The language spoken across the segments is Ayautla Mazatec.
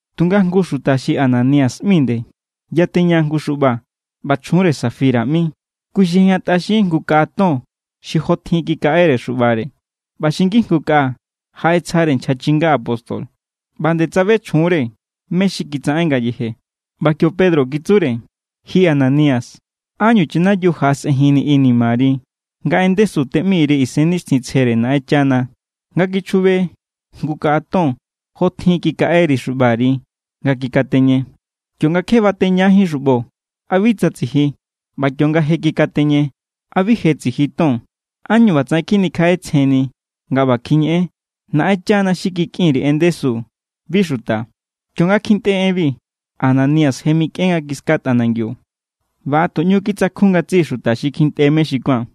Tunga jngu xuta xi Ananías ꞌmi nde yateña jngu xuꞌba. ꞌBa chjunre Safira ꞌmi. Kui xi ꞌejñatꞌaxin jngu kaꞌa ton xi jotjin kikaꞌere xuꞌbare ꞌba xi ngijngu kaꞌa jaꞌetsjare nchja chinga apóstol. ꞌBa nde tsabe chjunre mé= xi kitsaꞌen ngayeje. ꞌBa kio Pedro kitsure: —Ji Ananías, ¿ánñu chanayiu jaꞌasꞌenjinni inimari, nga en ndesu teꞌmi_ri Isennixtjintsjere Naꞌenchana nga kichjube jngu kaꞌa ton jotjin kikaꞌeri xuꞌbari nga kikateñe? Kionga kje bateñajín xuꞌbo, ¿a bi tsa tsiji? ꞌBa kionga je kikateñe, ¿a bi je tsiji ton? ¿Ánñu ꞌbatsaꞌen kjinikjaꞌetsjenni nga ꞌba kjiñeꞌen? Naꞌenchana xi kikꞌin_ri en ndesu, bi xuta. Kionga kjintꞌe enbi, Ananías je mikꞌen nga kiska tꞌanangiu. ꞌBa a tu ꞌñu kitsakjun ngatsiꞌi xuta xi kjintꞌe mé xi kuán.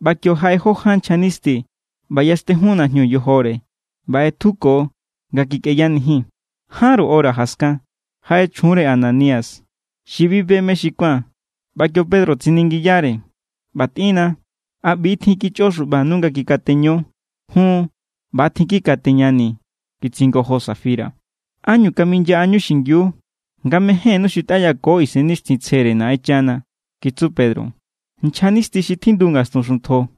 ꞌBa kio jaꞌe jó ján nchja nisti ꞌba yaxtejun najñu yojore, ꞌba ꞌetjuko nga kikꞌeyanijin. Jánru hora jaskan, jaꞌe chjunre Ananías xi bi be mé xi kuán. ꞌBa kio Pedro tsiningiyare: —ꞌBa tꞌinna ¿a ꞌbi= tjin kichꞌo xuꞌbanu nga kikateño? —Jun, ꞌba= tjin kikateñanii̱ —kitsingojo Safira. —¿Ánñu kaminyaꞌañu xingiu nga mejénnú xutꞌayako Isennixtjintsjere Naꞌenchana? —kitsu Pedro—. Nchjanisti xi tjindu ngastun xuntjo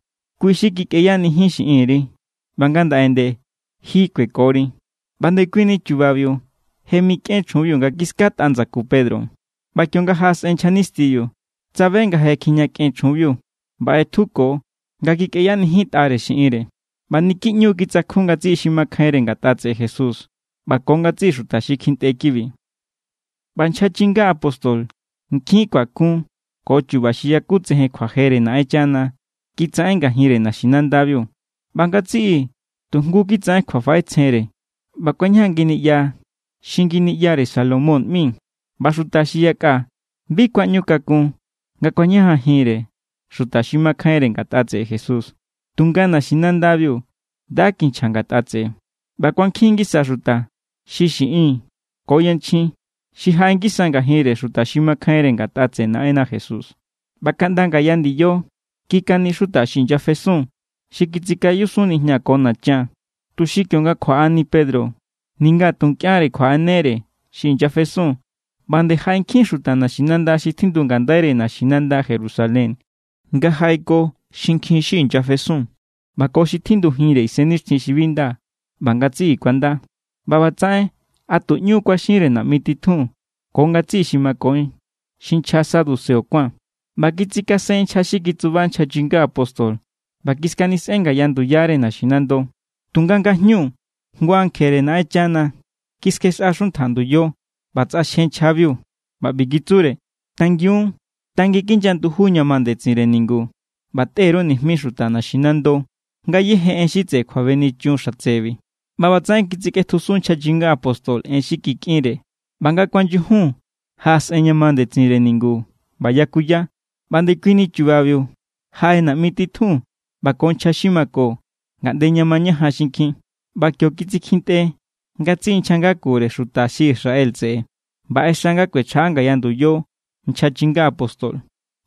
kui= xi kikꞌeyanijin xiꞌinri, ꞌba ngandaꞌe nde, ji kuekori. ꞌBa ndekuini chubabiu je mikꞌen chjunbiu nga kiskatꞌa ndsaku Pedro. ꞌBa kionga jaꞌasꞌen nchja nistibiu, tsabe nga je kjijñakꞌen chjunbiu ꞌba ꞌetjuko nga kikꞌeyanijintꞌare xiꞌinre. ꞌBa niki ꞌñu kitsakjun ngatsiꞌi xi makjainre ngatꞌare Jesús ꞌba ko ngatsiꞌi xuta xi kjintꞌe kibi. ꞌBa nchja chinga apóstol nkjin kjuakun ko chu̱ba̱ xi yakutsejen kjuajere Naꞌenchana kitsaꞌen ngajinre naxinandabiu, ꞌba ngatsiꞌi tu jngu kitsaꞌen kjuafaꞌetsjenre ꞌba kuañajan nginiꞌya xi Nginiꞌyare Salomón ꞌmi. ꞌBa xuta xi yakꞌa bi kuaꞌñukakun nga kuañajanjinre xuta xi makjainre ngatꞌa tseꞌe Jesús, tunga naxinandabiu nda kinchja ngatꞌa tseꞌe. ꞌBa kuankjin ngisa xuta, xi xiꞌin ko yanchjin, xi jaꞌe ngisa ngajinre xuta xi makjainre ngatꞌa tseꞌe Naꞌenna Jesús. ꞌBa kaꞌnda ngaya ndiyo kikani xuta xi inyasefesun xi kitsikayusun nijña ko nachan, tuxi kionga kjuaꞌani Pedro ninga tu nkꞌianre kjuaꞌanere xi inyafesun. ꞌBa nde jaꞌe nkjin xuta naxinanda xi tjindu ngandaire naxinanda Jerusalén nga jaꞌeko xinkjin xi inyasefesun ꞌba ko xi tjindujinre isennixtjin xi bi nda, ꞌba ngatsiꞌi kuanda. ꞌBa ꞌbatsaꞌen a tu ꞌñu kuaxinre naꞌmi titjun ko ngatsiꞌi xi mako xi nchja saduceo kuán. ꞌBa kitsikasen nchja xi kitsuba nchja chinga apóstol ꞌba kiskanisꞌen ngaya nduyare naxinando. Tunga ngajñu jngu ankjere Naꞌenchana kiskjexꞌa xuntja nduyo ꞌba tsꞌaxje nchjabiu ꞌba ꞌbi kitsure: —Tangiun, tanginkinya nduju ña ma ndetsinre ningu ꞌba tꞌe_ru nijmi xuta naximando ngayéje en xi tseꞌe kjuabenichun xatsebi. ꞌBa ꞌbatsaꞌen kitsikꞌetjusun nchja chinga apóstol en xi kikꞌinre. ꞌBa nga kuanyujun, jaꞌasꞌen ña ma ndetsinre ningu ꞌba yakuya. ꞌBa ndekui chubabiu jaꞌe naꞌmi titjun ꞌba ko nchja xi mako ngaꞌnde ña mañajan xinkjin. ꞌBa kio kitsikjintꞌe ngatsiꞌi nchja ngakure xuta xi Israel tseꞌe ꞌba ꞌexa nga kuechjaꞌa ngaya nduyo nchja chinga apóstol.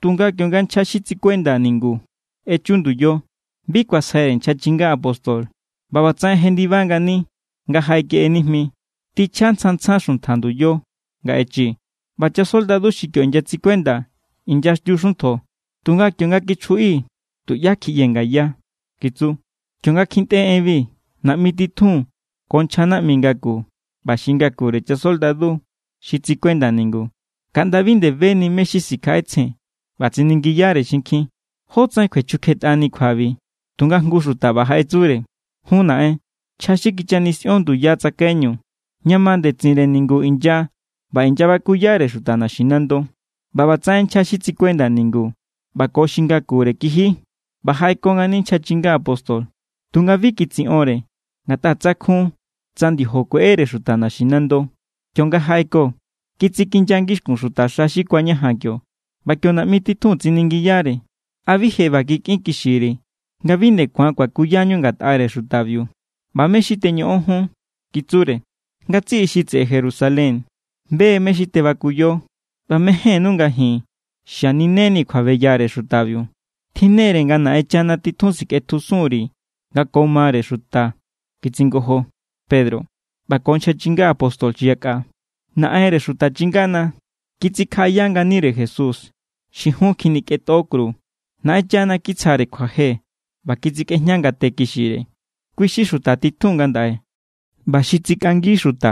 Tunga kionga nchja xi tsikuenda ningu echu nduyo, bi kuasjaire nchja chinga apóstol. ꞌBa ꞌbatsaꞌen jendiba ngani nga jaꞌekeꞌe nijmi. —Tichja tsjan tsjan xuntja nduyo nga echii̱. ꞌBa chasoldadu xi kio inyatsikuenda inyaxtiu xuntjo. Tunga kionga kichjuꞌi, tuꞌyá kjiꞌyee̱ ngaya —kitsu. Kionga kjintꞌe enbi, naꞌmi titjun ko nchja naꞌmi ngaku ꞌba xi ngakure chasoldadu xi tsikuenda ningu, kaꞌnda bi nde beni mé= xi sikjaꞌetsjen ꞌba tsiningiyare xinkjin jótsaꞌen kjuechukjetꞌani kjuabi. Tunga jngu xuta ꞌba jaꞌetsure: —Jun, naꞌen, nchja xi kichanisꞌion nduya tsakaiñu ña ma ndetsinre ningu= inya ꞌba inyabakuyare xuta naxinando. ꞌBa ꞌbatsaꞌen nchja xi tsikuenda ningu ꞌba ko xi ngakure kiji ꞌba jaꞌeko ngani nchja chinga apóstol. Tunga bi kitsiꞌonre ngatꞌa tsakjun tsa ndiojo kueꞌere xuta naxinando. Kionga jaꞌeko, kitsikinya ngixkun xutaxa xi kuañajan kio. ꞌBa kio naꞌmi titjun tsiningiyare: —¿A bi je ꞌba kikꞌinkixiri̱ nga bi nde ku̱an kuakuyañu ngatꞌare xutabiu? ꞌBa ¿mé= xi teñoꞌon jun? —kitsure—. Ngatsiꞌi xi tseꞌe Jerusalén be mé= xi tebakuyo, ꞌba mejénnú nga ji̱n xaninenii̱ kjuabeyare xutabiu. —Tjinnere nga Naꞌenchana titjun sikꞌetjusun_ri̱ nga ko mare xuta —kitsingojo Pedro ꞌba ko nchja chinga apóstol xi yakꞌa—. Naꞌenre xuta chingana kitsikjaꞌaya nganire Jesús, xi jun kjinikꞌentꞌo kru. Naꞌenchana kitsjare kjuaje ꞌba kitsikꞌejña ngate kixire. Kui= xi xuta titjun ngandaꞌe ꞌba xi tsikꞌangi xuta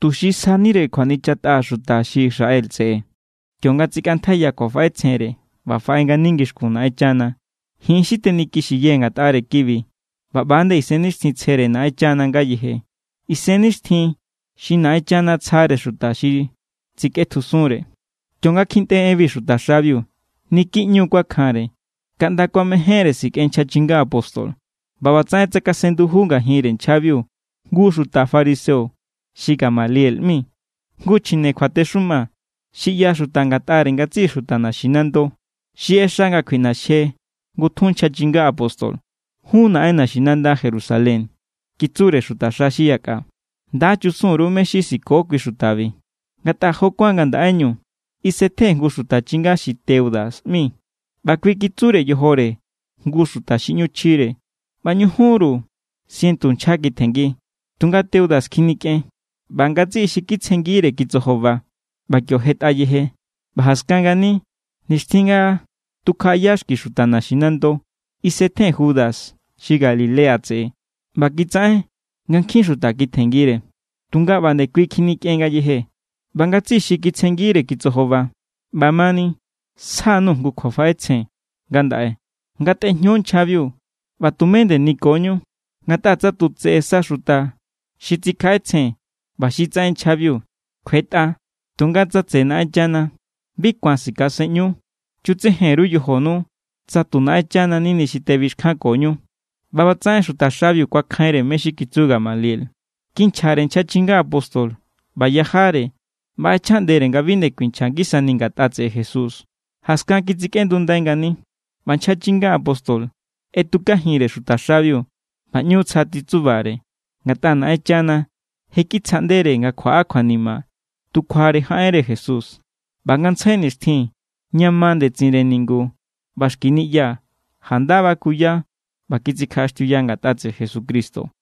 tuxi sjanire kjuanichatꞌa xuta xi Israel tseꞌe kionga tsikꞌantjaiya kjuafaꞌetsjenre ꞌba faꞌe ngani ngixkun Naꞌenchana. Ji̱n= xi tenikixiyee̱ ngatꞌare kibi ꞌba ꞌba nde Isennixtjintsjere Naꞌenchana ngayeje, Isennixtjin xi Naꞌenchana tsjare xuta xi tsikꞌetjusunre. Kionga kjintꞌe enbi xutaxabiu, niki ꞌñu kuakjanre, kaꞌnda kuamejénre sikꞌen nchja chinga apóstol. ꞌBa ꞌbatsaꞌen tsakasen nduju ngajinre nchjabiu jngu xuta fariseo xi Gamaliel ꞌmi, jngu chjine kjuatexuma xi ꞌyaxuta ngatꞌare ngatsiꞌi xuta naxinando. Xi ꞌexa nga kjuiꞌnaxje ngutjun nchja chinga apóstol. —Jun naꞌen naxinanda Jerusalén —kitsure xutaxa xi yakꞌa—, nda chusun_ru mé= xi siko kui xutabi. Ngatꞌa jo kuán ngandaꞌeñu, isetjen jngu xuta chinga xi Teuda ꞌmi. ꞌBa kui kitsure yojore jngu xuta xi ꞌñu chjire, ꞌba ñujunru sientu nchja kitjenngi. Tunga Teuda kjinikꞌen ꞌba ngatsiꞌi xi kitsjenngire kitsojoba. ꞌBa kio jetꞌa yeje. ꞌBa jaskan ngani, nixtjin nga tukjaꞌaya xki xuta naximando, isetjen Judas xi Galilea tseꞌe, ꞌba kitsaꞌen nga nkjin xuta kitjenngire. Tunga ꞌba nde kui kjinikꞌen ngayeje ꞌba ngatsiꞌi xi kitsjenngire kitsojoba. ’ꞌBamani, sja_nuu̱ jngu kjuafaꞌetsjen ngandaꞌe: Ngatꞌejño nchjabiu ꞌba tumé nde nikonu. Ngatꞌa tsa tu tseꞌe sa xuta xi tsikjaꞌetsjen ꞌba xi tsaꞌen nchjabiu, kjuetꞌa. Tunga tsa tseꞌe Naꞌenchana, bi ku̱an sikaseꞌñu. Chutsejen_ru yojonu tsa tu Naꞌenchana= nini xi tebixkjankoñu. ꞌBa ꞌbatsaꞌen xutaxabiu kuakjainre mé= xi kitsu Gamaliel. Kinchjare nchja chinga apóstol ꞌba yajare ꞌba ꞌechjaꞌndere nga bi nde kuinchja ngisani ngatꞌa tseꞌe Jesús. Jaskan kitsikꞌendundai ngani. ꞌBa nchja chinga apóstol ꞌetukajinre xutaxabiu ꞌba ꞌñu tsja titsubare, ngatꞌa Naꞌenchana je kitsjaꞌndere nga kjuaꞌa kjuanima tu kjuare jaꞌenre Jesús. ꞌBa ngantsjai nixtjin ña ma ndetsinre ningu ꞌba xki niꞌya janda bakuya ꞌba kitsikjaꞌaxtiuya ngatꞌa tseꞌe Jesucristo.